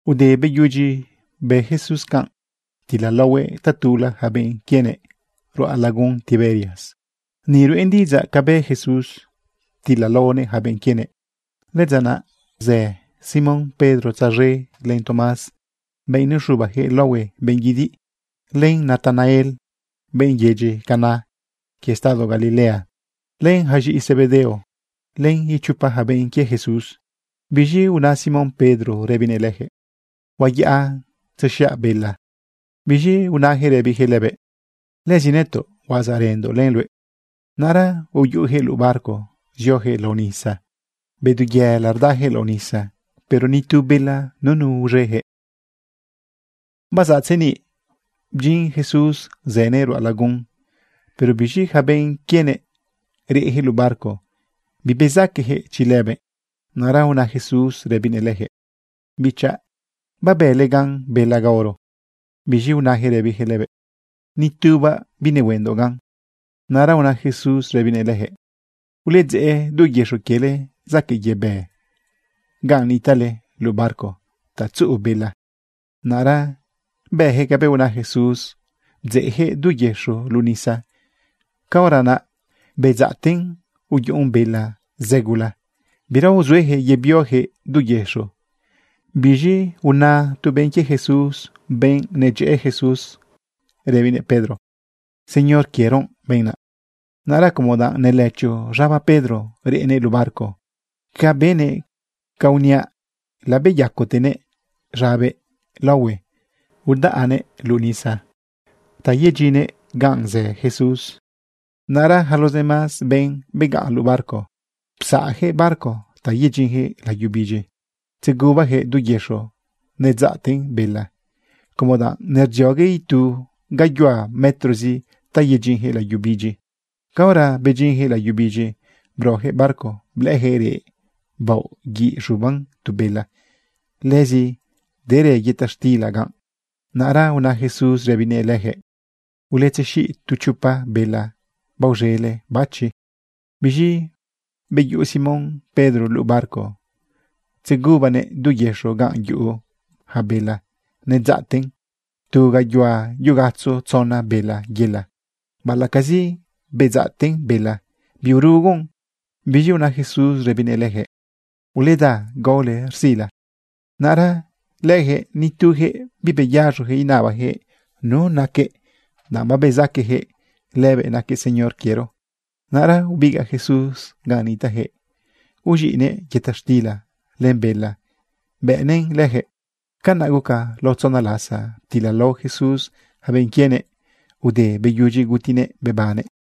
Ude beyudyi bë Jesús canꞌ, ptilalaohuëꞌ tatula yaca benꞌ quienëꞌ ruꞌa lagun Tiberias. Ni ruꞌen diꞌidzaꞌ ca bë Jesús ptilalaonëꞌ yaca benꞌ quienëꞌ. Lëdza naꞌ uzë Simón Pedro tzaz̃e len Tomás, benꞌ nexubayaquëꞌ laohue benꞌ guidiꞌ, len Natanael, benꞌ yedyi Caná quie estado Galilea, len yaca z̃iꞌi Zebedeo, len ichopa yaca benꞌ quie Jesús. Biz̃i una Simón Pedro rëbinëꞌ leyaquëꞌ: ―Huayaꞌa tzexiaꞌ bela. Biz̃i unayaquëꞌ rëbiyaquëꞌ lëbëꞌ: ―Lëzi nëtoꞌ huazaꞌrëndoꞌ len luëꞌ. Naꞌra uyuꞌuyaquëꞌ luꞌu barco zioyaquëꞌ lao nisa. Bedu yela rdayaquëꞌ lao nisa, pero nitu bela nunu uz̃eyaquëꞌ. Bazaꞌ tzeniꞌ bdyin Jesús zënëꞌ ruꞌa lagun. Pero biz̃i yaca benꞌ quienëꞌ, reꞌyaquëꞌ luꞌu barco, bibezaqueyaquëꞌ chi lëbëꞌ. Naꞌra una Jesús rëbinëꞌ leyaquëꞌ: ―Bichaꞌ, ¿babële gan bela gaoro? Biz̃i unayaquëꞌ rëbiyaquëꞌ lëbëꞌ: ―Ni tubaꞌ binehuendoꞌ gan. Naꞌra una Jesús rëbinëꞌ leyaquëꞌ: ―Uledzeꞌ du yëxo quiele zaquëꞌ yebë ganꞌ nitaꞌle luꞌu barco ta tzuꞌu bela. Naꞌra bëyaquëꞌ cabëꞌ una Jesús bdzeꞌyaquëꞌ du yëxo luꞌu nisa. Caora naꞌ bedzaꞌten uyuꞌun bela zë gula, bira uzueyaquëꞌ yebioyaquëꞌ du yëxo. Biz̃i una tu benꞌ quie Jesús, benꞌ Jesús nedyëꞌë, rëbinëꞌ Pedro: ―Señor quiero benꞌ naꞌ. Naꞌra como danꞌ nelëcho z̃aba Pedro reꞌnëꞌ luꞌu barco, ca benëꞌ ca uniaꞌ, labeyacatenëꞌ z̃abëꞌ laohue, udaꞌnëꞌ luꞌu nisa ta yedyinnëꞌ ganꞌ zë Jesús. Naꞌra yaca los demás benꞌ begaꞌn luꞌu barco, psaꞌyaquëꞌ barco ta yedyinyaquëꞌ layu bidyi. Tzegubayaquëꞌ du yëxo nedzaꞌten bela como danꞌ nerdziogue itu gayuhua metrozi ta yedyinyaquëꞌ layu bidyi. Caora bedyinyaquëꞌ layu bidyi, broyaquëꞌ barco blëꞌëyaquëꞌ reꞌ baoꞌ guiꞌ z̃uban tu bela. Lëzi derë yëta xtila ganꞌ. Naꞌra una Jesús rëbinëꞌ leyaquëꞌ: ―Uletzexiꞌ tu chopa bela baoz̃ele bachi. Biz̃i beyuꞌu Simón Pedro luꞌu barco, tzegubanëꞌ du yëxo ganꞌ yuꞌu yaca bela. Nedzaꞌten tu gayuhua yugatzo tzona bela yela. Baꞌalaꞌcazi bedzaꞌten bela, biurugon. Biz̃i una Jesús rëbinëꞌ leyaquëꞌ: ―Uleda gaole rzila. Naꞌra leyaquëꞌ nituyaquëꞌ bibeyaz̃oyaquëꞌ inabayaquëꞌ nu naquëꞌ danꞌ babezaqueyaquëꞌ lëbëꞌ naquëꞌ Señor quiero. Naꞌra ubigaꞌ Jesús ganꞌ nitaꞌyaquëꞌ, uz̃iꞌnëꞌ yëta xtila len bela bëꞌnëꞌn leyaquëꞌ. Canaꞌ guca lao tzona lasa ptilalao Jesús yaca benꞌ quienëꞌ ude beyudyi gutinëꞌ bebannëꞌ.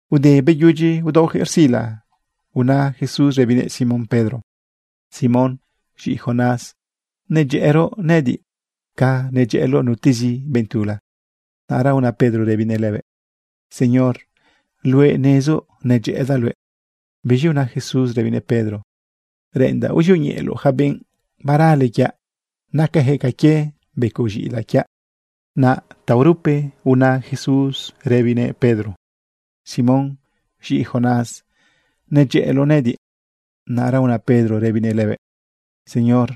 Ude beyudyi udaoyaquëꞌ rzila, una Jesús rëbinëꞌ Simón Pedro: ―Simón, z̃iꞌi Jonás, ¿nedyëꞌëroꞌ nëꞌëdiꞌ ca nedyëꞌëloꞌ nutezi benꞌ tula? Naꞌra una Pedro rëbinëꞌ lëbëꞌ: ―Señor, luëꞌ nezoꞌ nedyëꞌëdaꞌ luëꞌ. Biz̃i una Jesús rëbinëꞌ Pedro: ―Reꞌendaꞌ uzioñeꞌeloꞌ yaca benꞌ barale quiaꞌ. Nacayaquëꞌ ca quie becoꞌ z̃iꞌilaꞌ quiaꞌ. Naꞌ taorupe una Jesús rëbinëꞌ Pedro: ―Simón, z̃iꞌi Jonás, ¿nedyëꞌëloꞌ nëꞌëdiꞌ? Naꞌra una Pedro rëbinëꞌ lëbëꞌ: ―Señor,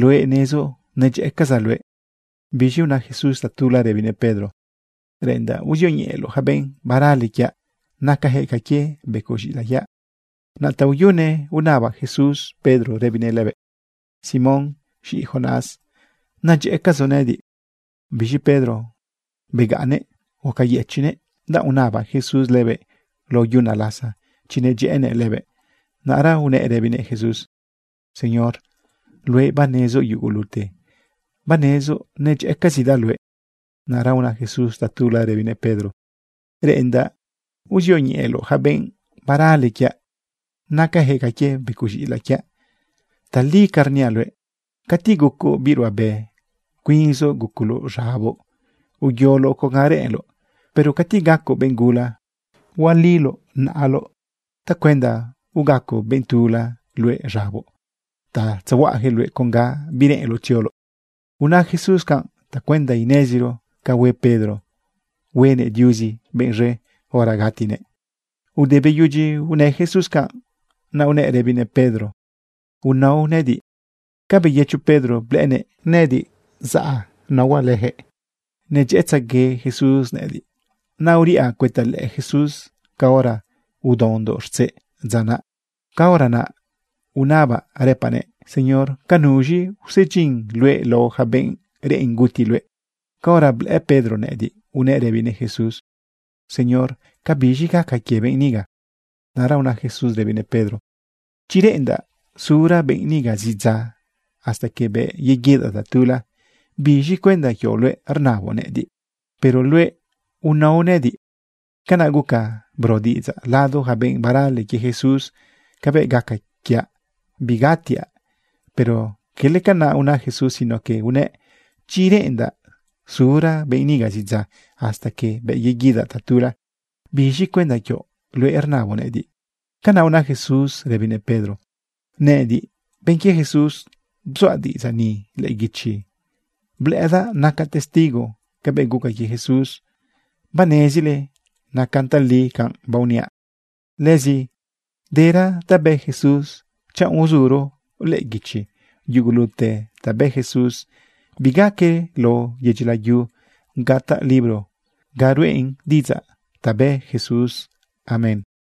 luëꞌ nezoꞌ nedyëꞌëcazaꞌ luëꞌ. Biz̃i una Jesús tatula rëbinëꞌ Pedro: ―Reꞌendaꞌ uzioñeꞌeloꞌ yaca benꞌ barale quiaꞌ. Nacayaquëꞌ ca quie becoꞌ z̃iꞌilaꞌ quiaꞌ. Naꞌ taoyune unaba Jesús Pedro rëbinëꞌ lëbëꞌ: ―Simón, z̃iꞌi Jonás, ¿nedyëꞌëcazoꞌ nëꞌëdiꞌ? Biz̃i Pedro begaꞌnnëꞌ gucayëchiꞌnëꞌ, danꞌ unaba Jesús lëbëꞌ lao yuna lasa chi nedyëꞌënëꞌ lëbëꞌ. Naꞌra unëꞌ rëbinëꞌ Jesús: ―Señor, luëꞌ banezoꞌ yugulute, banezoꞌ nedyëꞌëcazidaꞌ luëꞌ. Naꞌra una Jesús tatula rëbinëꞌ Pedro: ―Reꞌendaꞌ uzioñeꞌeloꞌ yaca benꞌ barale quiaꞌ. Nacayaquëꞌ ca quie becoꞌ z̃iꞌilaꞌ quiaꞌ. Tali ca rniaꞌ luëꞌ, cati gucoꞌ biꞌ ruꞌabe, cuinzoꞌ gucoloꞌ z̃aboꞌ uyoloꞌ con ga reꞌenloꞌ, pero cati gacoꞌ benꞌ gula, hualioꞌ naꞌaloꞌ tacuenda ugaco benꞌ tula luëꞌ z̃aboꞌ ta tzehuaꞌayaquëꞌ luëꞌ con ga bireꞌenloꞌ tzioloꞌ. Una Jesús canꞌ tacuenda ineziro ca hue Pedro huenëꞌ Diuzi benꞌ z̃e hora gatinëꞌ. Ude beyudyi unë Jesús canꞌ, naꞌ unëꞌ rëbinëꞌ Pedro: ―Unao nëꞌëdiꞌ. Ca beyëcho Pedro, blëꞌënëꞌ nëꞌëdiꞌ zaꞌ naohuaꞌ leyaquëꞌ. Nedyëꞌëtzegue Jesús nëꞌëdiꞌ. Naꞌ uriꞌa cuëta lëꞌë Jesús caora udaondoꞌ rtzeꞌ dza naꞌ. Caora naꞌ unabaꞌ rëpaꞌnëꞌ: “Señor, ¿ca nuz̃i usedyin luëꞌ lao yaca benꞌ reꞌen guti luëꞌ?” Caora blëꞌë Pedro nëꞌëdiꞌ, unëꞌ rëbinëꞌ Jesús: ―Señor, ¿cabiz̃i gaca quie benꞌ niga? Naꞌra una Jesús rëbinëꞌ Pedro: ―Chi reꞌendaꞌ sura benꞌ niga zidza hasta que bëꞌ yeguidaꞌ tatula, ¿biz̃cuenda quioꞌ luëꞌ rnaboꞌ nëꞌëdiꞌ? Pero luëꞌ, unao nëꞌëdiꞌ. Canaꞌ guca bro diꞌidzaꞌ lado yaca benꞌ barale quie Jesús cabëꞌ gaca quiaꞌ bigatiaꞌ. Pero cala canaꞌ una Jesús, sino que unëꞌ: “Chi reꞌendaꞌ sura benꞌ niga zidza, hasta que bëꞌ yeguidaꞌ tatula, ¿biz̃cuenda quioꞌ luëꞌ rnaboꞌ nëꞌëdiꞌ?” Canaꞌ una Jesús rëbinëꞌ Pedro. Nëꞌëdiꞌ, benꞌ quie Jesús, bzuaꞌ diꞌidzaꞌ ni lëꞌë guichi. Blëꞌëdaꞌ nacaꞌ testigo cabëꞌ guca quie Jesús. Banezile nacan tali canꞌ baoniaꞌ. Lëzi dera ta bë Jesús. Chanꞌ uzuro lëꞌë guichi yugulute ta bë Jesús, bigaque lao yedyi layu gataꞌ libro ga ruꞌen diꞌidzaꞌ ta bë Jesús. Amén.